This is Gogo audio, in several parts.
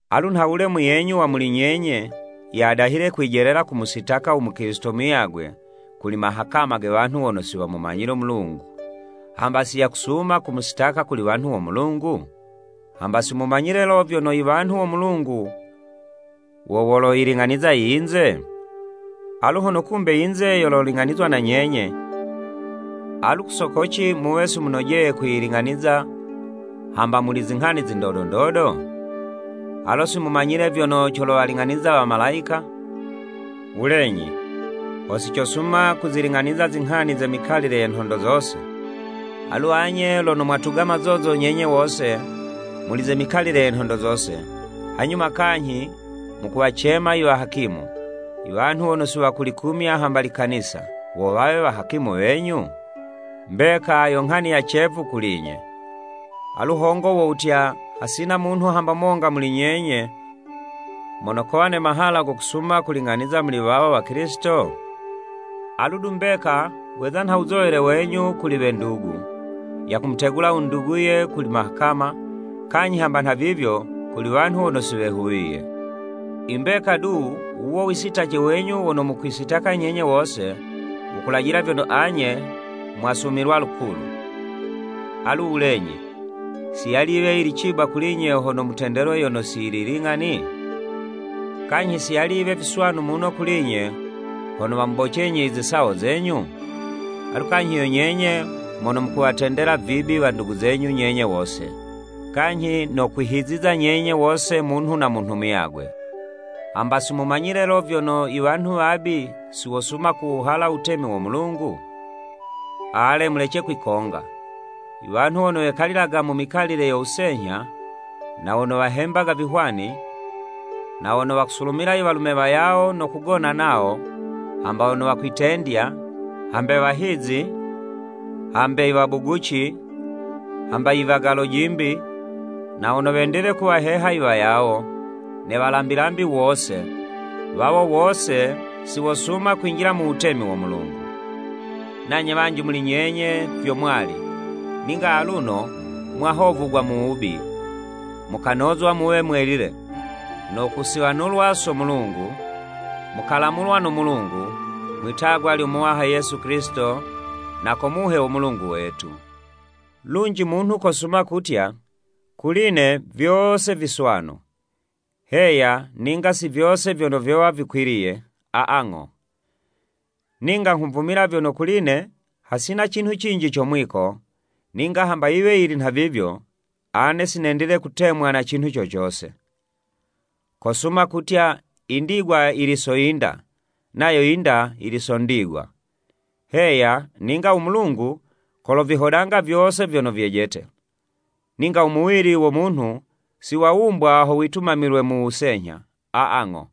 Alu nhawule muyenyu wa muli nyenye, yadahile kwijelela kumusitaka u mukilisito muyagwe, kuli mahakama ge wanhu wono si wamumanyile u Mulungu, hamba si yakusuma kumusitaka kuli wanhu wo Mulungu? Hamba si mumanyile lo, vyono i wanhu wo Mulungu wo woloyiling'aniza i yinze? Alu hono kumbe yinze yololing'anizwa na nyenye, alu ku soko ci muwe si munojeye kwiyiling'aniza hamba muli izinghani zi ndodo ndodo? Alo si mumanyile vyono colowaling'aniza wamalayika? Wulenyi, ho sicosuma kuziling'aniza zinghani ze mikalile ye nhondo zose! Alu anye lono mwatuga mazozo nyenye wose, muli ze mikalile ye nhondo zose, hanyuma kanyhi mukuwacema i wahakimu, i wanhu wono si wakulikumya hamba likanisa wo wawe wahakimu wenyu? Mbeka yo nghani ya cevu kuli'nye! Alu hongo wo wutya, hasina munhu hamba monga muli nyenye, mono kowa ne mahala go kusuma kuling'aniza muli wawo Wakilisito? Alu du mbeka weza nha wuzowele wenyu kuli we ndugu, yakumutegula u nduguye kuli mahakama, kanyhi hamba nhavivyo, kuli wanhu wono si wehuwiye. I mbeka du, wuwo u wisitace wenyu wono mukwisitaka nyenye wose, wukulajila vyono anye mwasumilwa lukulu! Alu wulenyi, si yali yiwe yili ciba kuli'nye hono mutendelwe yono si yili ling'ani? Kanyhi si yali yiwe viswanu muno kuli'nye, hono wamubocenyi i zisawo zenyu. Alu kanyhi yo nyenye mono mukuwatendela vibi wandugu zenyu nyenye wose, kanyhi no kwihiziza nyenye wose munhu na munhu muyagwe! Hamba si mumanyile lo, vyono i wanhu wabi, si wosuma kuwuhala u wutemi wo Mulungu? Ale, mulece kwikonga! Iwanhu wono wekalilaga mu mikalile yo wusenyha, na wono wahembaga vihwani, na wono wakusulumila i walume wayawo no kugona nawo, hamba wono wakwitendya, hambe wahizi, hambe i wabuguci, hamba i wagalo'jimbi, na wono wendile kuwaheha i wayawo, ne walambilambi wose, wawo wose si wosuma kwinjila mu wutemi wo Mulungu. Nanye wanji muli nyenye vyo mwali, ninga aluno mwahovugwa mu wubi, mukanozwa muwe mwelile, no kusiwanulwa so Mulungu, mukalamulwa no Mulungu, mwi'tagwa lyo Muwaha Yesu Kilisito na ko Muhe wo Mulungu wetu. Lunji munhu kosuma kutya, “Kuli'ne vyose viswanu.” Heya, ninga si vyono vyose vyowa vikwiliye, aa ng'o. Ninga nghuvumila vyono kuli'ne hasina cinhu cinji co mwiko, ninga hamba yiwe yili nhavivyo, ane si nendile kutemwa na cinhu co cose. Kosuma kutya, “Indigwa yili so yinda, nayo yinda yili so ndigwa.” Heya, ninga u Mulungu, kolovihodanga vyose vyono vyejete. Ninga u muwili wo munhu si wawumbwa ho witumamilwe mu wusenyha, aa ng'o,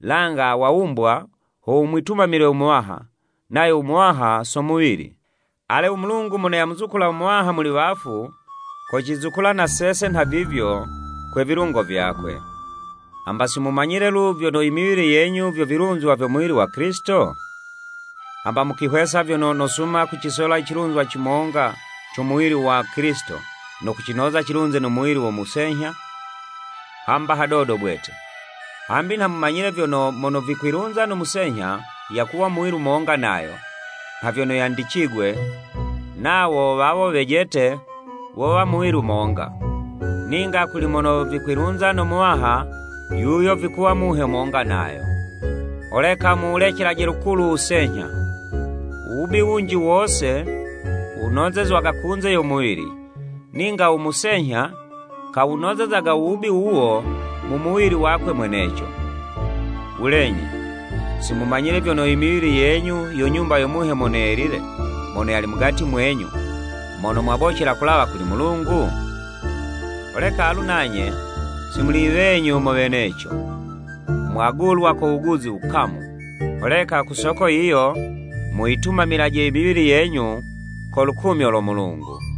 langa wawumbwa ho wumwitumamile u Muwaha, nayo u Muwaha so muwili. Ale u Mulungu mono yamuzukula u Muwaha muli wafu, kocizukula na sese nhavivyo kwe vilungo vyakwe. Hamba si mumanyile lu, vyono i miwili yenyu vyo vilunzwa vyo muwili wa Kilisito? Hamba mukwihwesa vyono nosuma kucisola i cilunzwa cimonga co muwili wa Kilisito, no kucinoza cilunze no muwili wo musenyha? Hamba hadodo bwete! Hambi nha mumanyile vyono, mono vikwilunza no musenyha, yakuwa muwili monga nayo, nha vyono yandicigwe, “Nawo wawo wejete, wowa muwili monga.” Ninga kuli mono vikwilunza no Muwaha yuyo vikuwa muhe monga nayo. Holeka muwulecelaje lukulu u wusenyha. U wubi wunji wose wunozezwaga kunze yo muwili, ninga u musenyha, kawunozezaga u wubi wuwo mu muwili wakwe mweneco. Wulenyi, si mumanyile vyono i miwili yenyu yo Nyumba yo Muhe Mono Yelile mono yali mugati mwenyu, mono mwamubocela kulawa kuli Mulungu? Holeka alu nanye, si muli wenyu mo weneco. Mwagulwa ko wuguzi wukamu. Holeka ku soko yiyo, muyitumamilaje i miwili yenyu ko lukumyo lo Mulungu.